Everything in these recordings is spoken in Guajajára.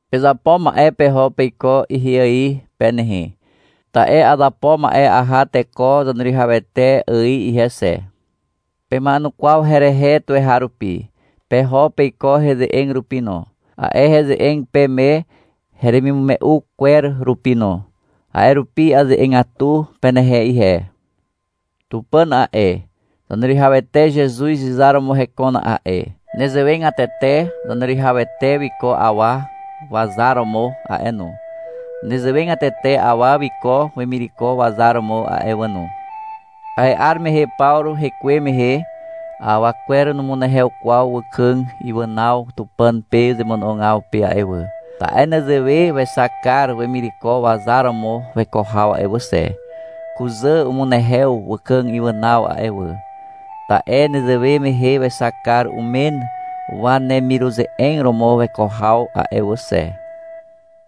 Pezapo ma'e peho peiko ihe ài pe nehe. Ta'e azapo ma'e aha teko Zaneruwihawete ài ihe xe. Pema'enukwaw herehe tuweharupi, peho peiko heze'eg rupi no, a'e heze'eg peme heremimume'u kwer rupi no. A'e rupi aze'egatu penehe ihe. Tupàn a'e, Zaneruwihawete Zezuz izar romo hekon a'e. Nezewegatete Zaneruwihawete wiko awa wazar romo a'e no. Nezewegatete awa wiko wemireko wazar romo a'e wà no. (A'e 'ar mehe Pawru hekuwe mehe, awa kwer numunehew kwaw wakàg iwànaw Tupàn pe zemono'ogaw pe a'e wà, ta'e nezewe wexak kar wemireko wazar romo weko haw a'e wà xe. Kuzà umunehew wàkàg iwànaw a'e wà, ta'e nezewe mehe wexak kar umen wanemiruze'eg romo weko haw a'e wà xe.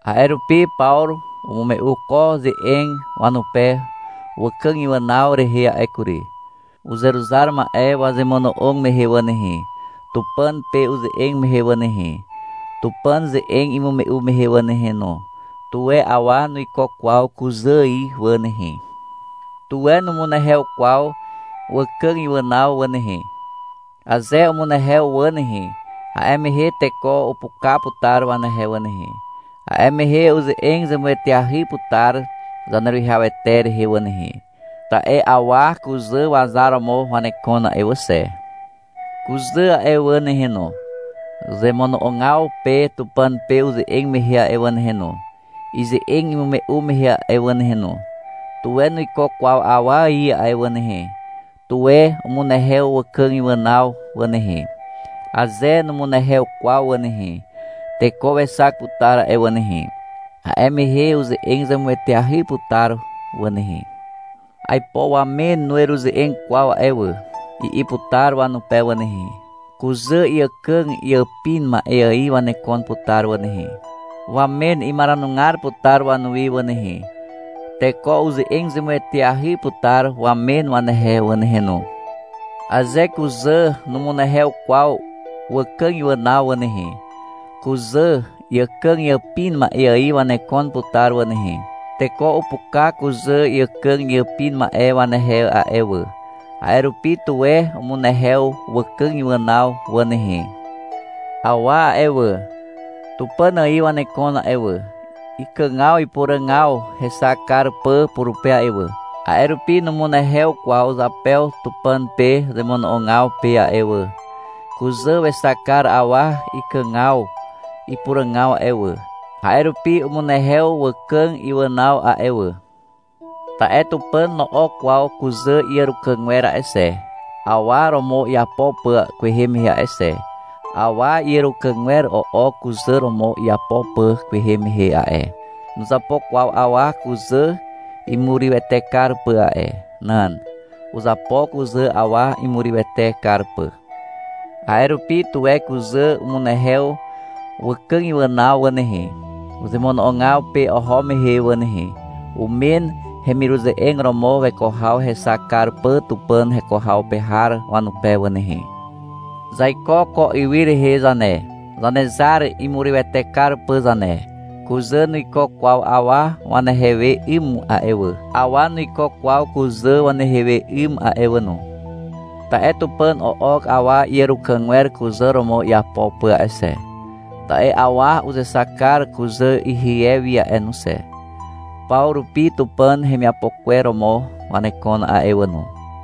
A'e rupi Pawru umume'u ko ze'eg wanupe wàkàg iwànaw rehe a'e kury.) Uzeruzar ma'e wazemono'og mehe wà nehe, Tupàn pe uze'eg mehe wà nehe, Tupàn ze'eg imume'u mehe wà nehe no, tuwe awa nuiko kwaw kuzà ài wà nehe. Tuwe numunehew kwaw wàkàg iwànaw wà nehe. Aze umunehew wà nehe, a'e mehe teko upuka putar wanehe wà nehe, a'e mehe uze'eg zemueteahy putar Zaneruwihawete rehe wà nehe. Ta'e awa kuzà wazar romo wanekon a'e wà xe. Kuzà a'e wà nehe no, zemono'ogaw pe Tupàn pe uze'eg mehe a'e wà nehe no, ize'eg imume'u mehe a'e wà nehe no, tuwe nuiko kwaw awa ài a'e wà nehe. Tuwe umunehew wàkàg iwànaw wà nehe. Aze numunehew kwaw wà nehe, teko wexak putar a'e wà nehe. A'e mehe uze'eg zemueteahy putar wà nehe. — Aipo wamen nueruze'eg kwaw a'e wà, i'i putar wanupe wà nehe. Kuzà iàkàg iàpin ma'e ài wanekon putar wà nehe. Wamen imaranugar putar wanuwi wà nehe. Teko uze'eg zemueteahy putar wamen wanehe wà nehe no. Aze kuzà numunehew kwaw wàkàg iwànaw wà nehe, kuzà iàkàg iàpin ma'e ài wanekon putar wà nehe. Teko upuka kuzà iàkàg iàpin ma'e wanehe a'e wà. A'e rupi, tuwe umunehew wàkàg iwànaw wà nehe. Awa a'e wà, Tupàn ài wanekon a'e wà, ikàgaw ipuràgaw hexak kar pà purupe a'e wà. A'e rupi numunehew kwaw zapew Tupàn pe zemono'ogaw pe a'e wà. Kuzà wexak kar awa ikàgaw ipuràgaw a'e wà, a'e rupi umunehew wàkàg iwànaw a'e wà. Ta'e Tupàn no'ok kwaw kuzà iàrukàgwer a'e xe, awa romo iapo pà kwehe mehe a'e xe. Awa iàrukàgwer o'ok kuzà romo iapo pà kwehe mehe a'e. Nuzapo kwaw awa kuzà imurywete kar pà a'e. Nan. Uzapo kuzà awa imurywete kar pà. A'e rupi, tuwe kuzà umunehew wàkàg iwànaw wà nehe, zemono'ogaw pe oho mehe wà nehe, umen hemiruze'eg romo weko haw hexak kar pà Tupàn heko haw pe har wanupe wà nehe. Zaiko ko ywy rehe zane, Zanezar imurywete kar pà zane. Kuzà nuiko kwaw awa wanehe we 'ym a'e wà. Awa nuiko kwaw kuzà wanehe we 'ym a'e wà no. Ta'e Tupàn o'ok awa iàrukàgwer kuzà romo iapo pà a'e xe. Ta'e awa uzexak kar kuzà rie wi a'e no xe. Paw rupi Tupàn hemiapo kwer romo wanekon a'e wà no.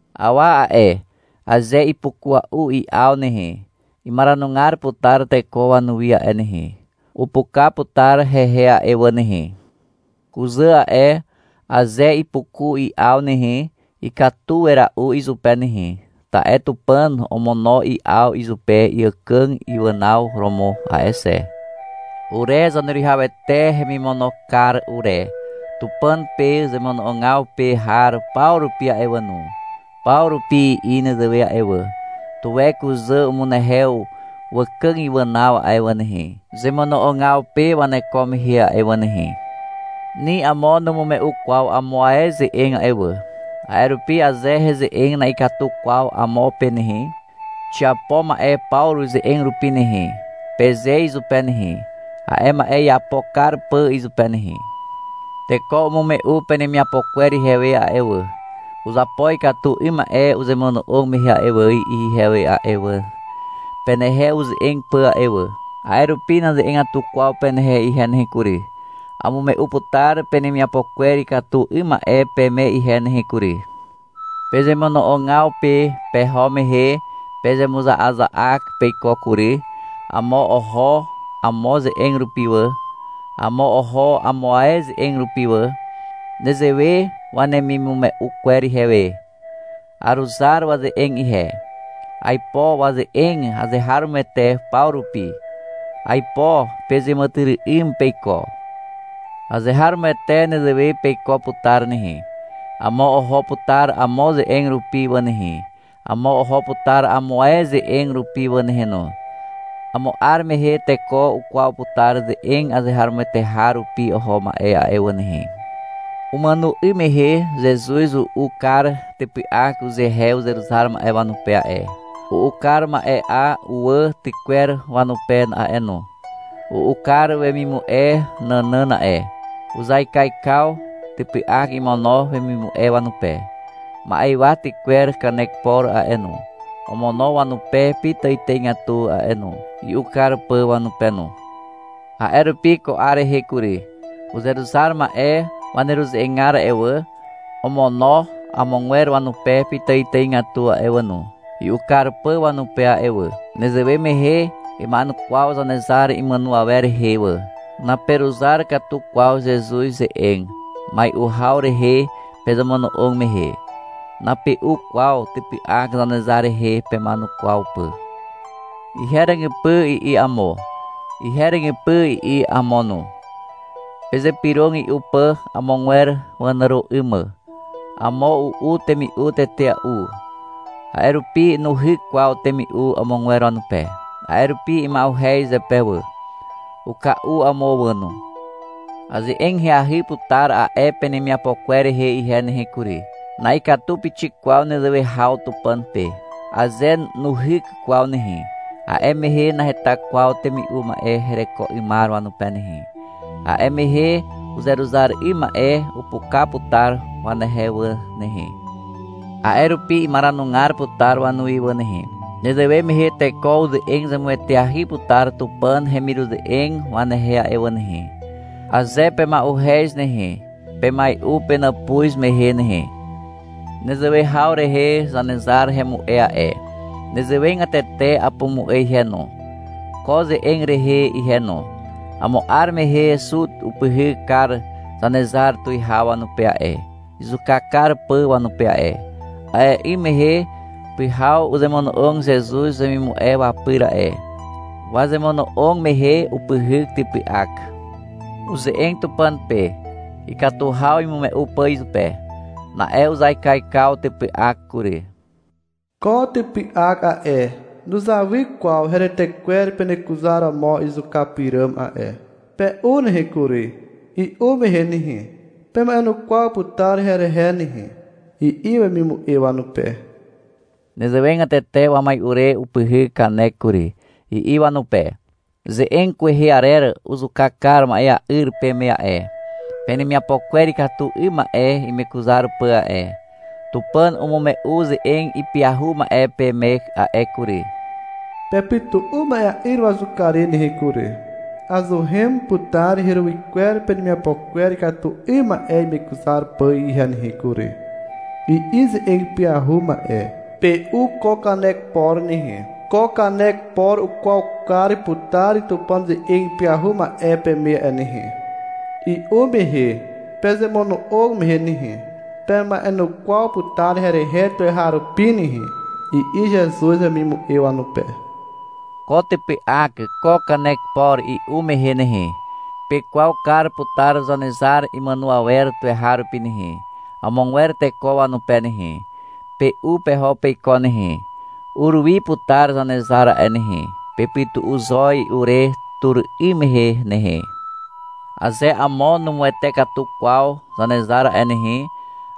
Awa a'e, aze ipukua'u i'aw nehe, imaranugar putar teko wanuwi a'e nehe. Upuka putar hehe a'e wà nehe. Kuzà a'e, aze ipukua'u i'aw nehe, ikatu wera'u izupe nehe, ta'e Tupàn omono i'aw izupe iàkàg iwànaw romo a'e xe. Ure Zaneruwihawete hemimono kar ure, Tupàn pe zemono'ogaw pe har paw rupi a'e wà no, paw rupi i'i nezewe a'e wà. Tuwe kuzà umunehew wàkàg iwànaw a'e wà nehe, zemono'ogaw pe waneko mehe a'e wà nehe. Ni amo numume'u kwaw amo ae ze'eg a'e wà. A'e rupi aze heze'eg na'ikatu kwaw amo pe nehe, — Xiapo ma'e Pawru ze'eg rupi nehe, peze izupe nehe, a'e ma'e iapo kar pà izupe nehe. Teko umume'u penemiapo kwer ihewe a'e wà. — Uzapo ikatu 'ym ma'e uzemono'og mehe wà, i'i ihewe a'e wà, penehe uze'eg pà a'e wà. A'e rupi naze'egatu kwaw penehe ihe nehe kury. Amume'u putar penemiapo kwer ikatu 'ym ma'e peme ihe nehe kury. Pezemono'ogaw pe peho mehe pezemuza'aza'ak peiko kury. Amo oho amo ze'eg rupi wà. Amo oho amo ae ze'eg rupi wà. Nezewe wanemimume'u kwer ihewe. Aruzar waze'eg ihe. Aipo waze'eg azeharomoete paw rupi. Aipo pezeàmàtyry'ym peiko. Azeharomoete nezewe peiko putar nehe. Amo oho putar amo ze'eg rupi wà nehe, amo oho putar amo ae ze'eg rupi wà nehe no. Amo 'ar mehe teko ukwaw putar ze'eg azeharomoete har rupi oho ma'e a'e wà nehe. (Umàno 'ym mehe Zezuz u'u kar typy'ak uzehe uzeruzar ma'e wanupe a'e, u'u kar ma'e'a uwà tykwer wanupe a'e no. U'u kar wemimu'e nànàn a'e. Uzaikaikaw typy'ak imono wemimu'e wanupe. Ma'ywa tykwer kanek por a'e no, omono wanupe pitàitàigatu a'e no, i'u kar pà wanupe no. A'e rupi ko 'ar rehe kury, uzeruzar ma'e waneruze'egar a'e wà, omono amogwer wanupe pitàitàigatu a'e wà no, i'u kar pà wanupe a'e wà. Nezewe mehe ima'enukwaw Zanezar imàno awer rehe wà.) Naperuzar katu kwaw Zezuz ze'eg, mai'u haw rehe pezemono'og mehe. Nape'u kwaw typy'ak Zanezar rehe pema'enukwaw pà. — Ihe ràgypy, i'i amo. — Ihe ràgypy, i'i amo no. Pezypyrog i'u pà amogwer wanàro 'ym mà. Amo u'u temi'u tetea'u, a'e rupi nuhyk kwaw temi'u amogwer wanupe. A'e rupi ima'uhez zepe wà. Uka'u amo wà no. Aze'eg ahyahy putar a'e penemiapo kwer rehe ihe nehe kury. Na'ikatu pixik kwaw nezewe haw Tupàn pe. Aze nuhyk kwaw nehe, a'e mehe naheta kwaw temi'u ma'e hereko 'ymar wanupe nehe. A'e mehe uzeruzar 'ym ma'e upuka putar wanehe wà nehe. A'e rupi imaranugar putar wanuwi wà nehe. Nezewe mehe teko uze'eg zemueteahy putar Tupàn hemiruze'eg wanehe a'e wà nehe. Aze pema'uhez nehe, pemai'u penàpuz mehe nehe. Nezewe haw rehe Zanezar hemu'e a'e. Nezewegatete apumu'e ihe no, ko ze'eg rehe ihe no. Amo 'ar mehe Zut upyhyk kar Zanezar tuwihaw wanupe a'e, izuka kar pà wanupe a'e. A'e 'ym mehe pyhaw uzemono'og Zezuz wemimu'e wapyr a'e. Wazemono'og mehe upyhyk typy'ak. Uze'eg Tupàn pe, ikatu haw imume'u pà izupe. Na'e uzaikaikaw typy'ak kury. — Ko typy'ak a'e, nuzawy kwaw heretekwer penekuzaromo izuka pyràm a'e. Pe'u nehe kury. I'u mehe nehe, pema'enukwaw putar herehe nehe, i'i wemimu'e wanupe. Nezewegatete wamai'u re upyhyk kanek kury. I'i wanupe. — Ze'eg kwehe arer uzuka kar ma'ea'yr peme a'e, penemiapo kwer ikatu 'ym ma'e imekuzar pà a'e. Tupàn umume'u uze'eg ipyahu ma'e peme a'e kury. (Pepytu'u ma'ea'yr wazuka re nehe kury. Azuhen putar heruwy kwer penemiapo kwer ikatu 'ym ma'e imekuzar pà ihe nehe kury, i'i ze'eg ipyahu ma'e.) Pe'u ko kanek por nehe. Ko kanek por ukwaw kar putar Tupàn ze'eg ipyahu ma'e peme a'e nehe. I'u mehe, pezemono'og mehe nehe, pema'enukwaw putar herehe tuweharupi nehe, i'i Zezuz wemimu'e wanupe. Ko typy'ak ko kanek por i'u mehe nehe, pekwaw kar putar Zanezar imàno awer tuweharupi nehe, amogwer teko wanupe nehe. Pe'u peho peiko nehe. Ur wi putar Zanezar a'e nehe. Pepytu'u zo i'u re tur 'ym mehe nehe. Aze amo numuwete katu kwaw Zanezar a'e nehe,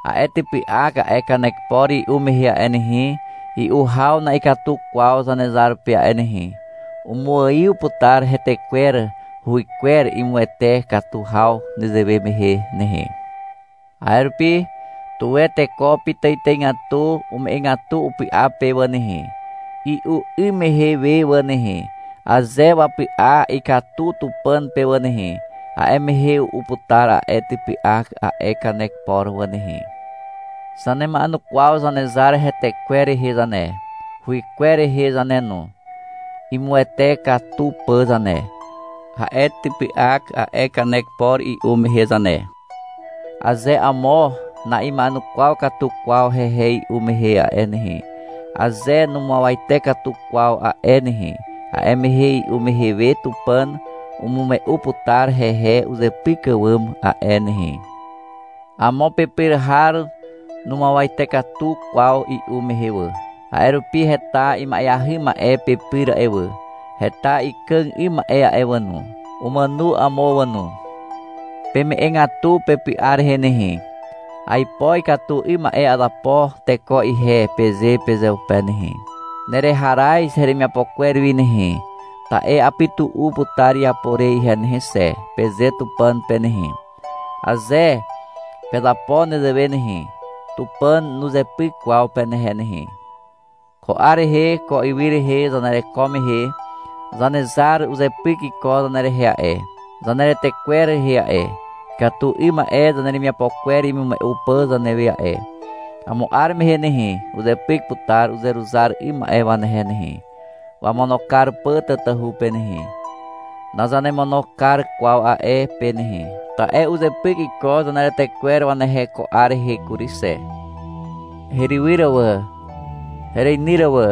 a'e typy'ak a'e kanek por i'u mehe a'e nehe, i'u haw na'ikatu kwaw Zanezar pe a'e nehe, umuaiw putar hetekwer huwykwer imuwete katu haw nezewe mehe nehe. A'e rupi, tuwe teko pitàitàigatu ume'egatu upy'a pe wà nehe, i'u 'ym mehe we wà nehe. Aze wapy'a ikatu Tupàn pe wà nehe, a'e mehe u'u putar a'e typy'ak a'e kanek por wà nehe. (Zanema'enukwaw Zanezar hetekwer rehe zane, huwykwer rehe zane no, imuwete katu pà zane, a'e typy'ak a'e kanek por i'u mehe zane.) Aze amo na'ima'enukwaw katu kwaw hehe i'u mehe a'e nehe, aze numuawate katu kwaw a'e nehe, a'e mehe i'u mehe we Tupàn umume'u putar hehe uzepyk àwàm a'e nehe. Amo pepyr har numuawate katu kwaw i'u mehe wà. A'e rupi heta ima'eahy ma'e pepyr a'e wà, heta ikàg 'ym ma'e a'e wà no. Umàno amo wà no. Peme'egatu pepy'a rehe nehe. — Aipo ikatu 'ym ma'e azapo teko ihe, peze pezeupe nehe. — Nereharaz heremiapo kwer wi nehe, ta'e apytu'u putar iapo re ihe nehe xe, peze Tupàn pe nehe. Aze pezapo nezewe nehe, Tupàn nuzepyk kwaw penehe nehe. Ko 'ar rehe ko ywy rehe zanereko mehe, Zanezar uzepyk iko zanerehe a'e, zaneretekwer rehe a'e, ikatu 'ym ma'e zaneremiapo kwer imume'u pà zanewe a'e. Amo 'ar mehe nehe, uzepyk putar uzeruzar 'ym ma'e wanehe nehe, wamono kar pà tatahu pe nehe. Nazanemono kar kwaw a'e pe nehe, ta'e uzepyk iko zaneretekwer wanehe ko 'ar rehe kury xe. Herywyr wà hereinyr wà,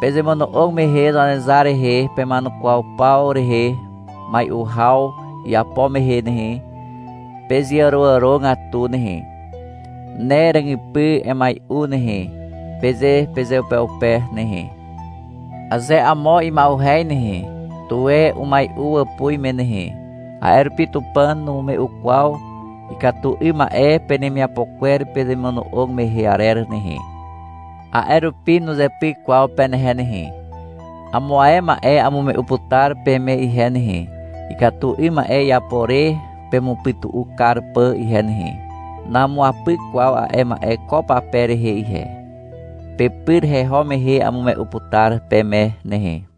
pezemono'og mehe Zanezar rehe pema'enukwaw paw rehe mai'u haw iapo mehe nehe, pezeàroàrogatu nehe. — Ne ràgypy emai'u nehe, peze pezeupeupe nehe. Aze amo ima'uhez nehe, tuwe umai'u wàpuz me nehe. A'e rupi Tupàn numume'u kwaw ikatu 'ym ma'e penemiapo kwer pezemono'og mehe arer nehe. A'e rupi nuzepyk kwaw penehe nehe. Amo ae ma'e amume'u putar peme ihe nehe, ikatu 'ym ma'e iapo re pemupytu'u kar pà ihe nehe. Namuapyk kwaw a'e ma'e ko pape rehe ihe. Pepyr heho mehe amume'u putar peme nehe.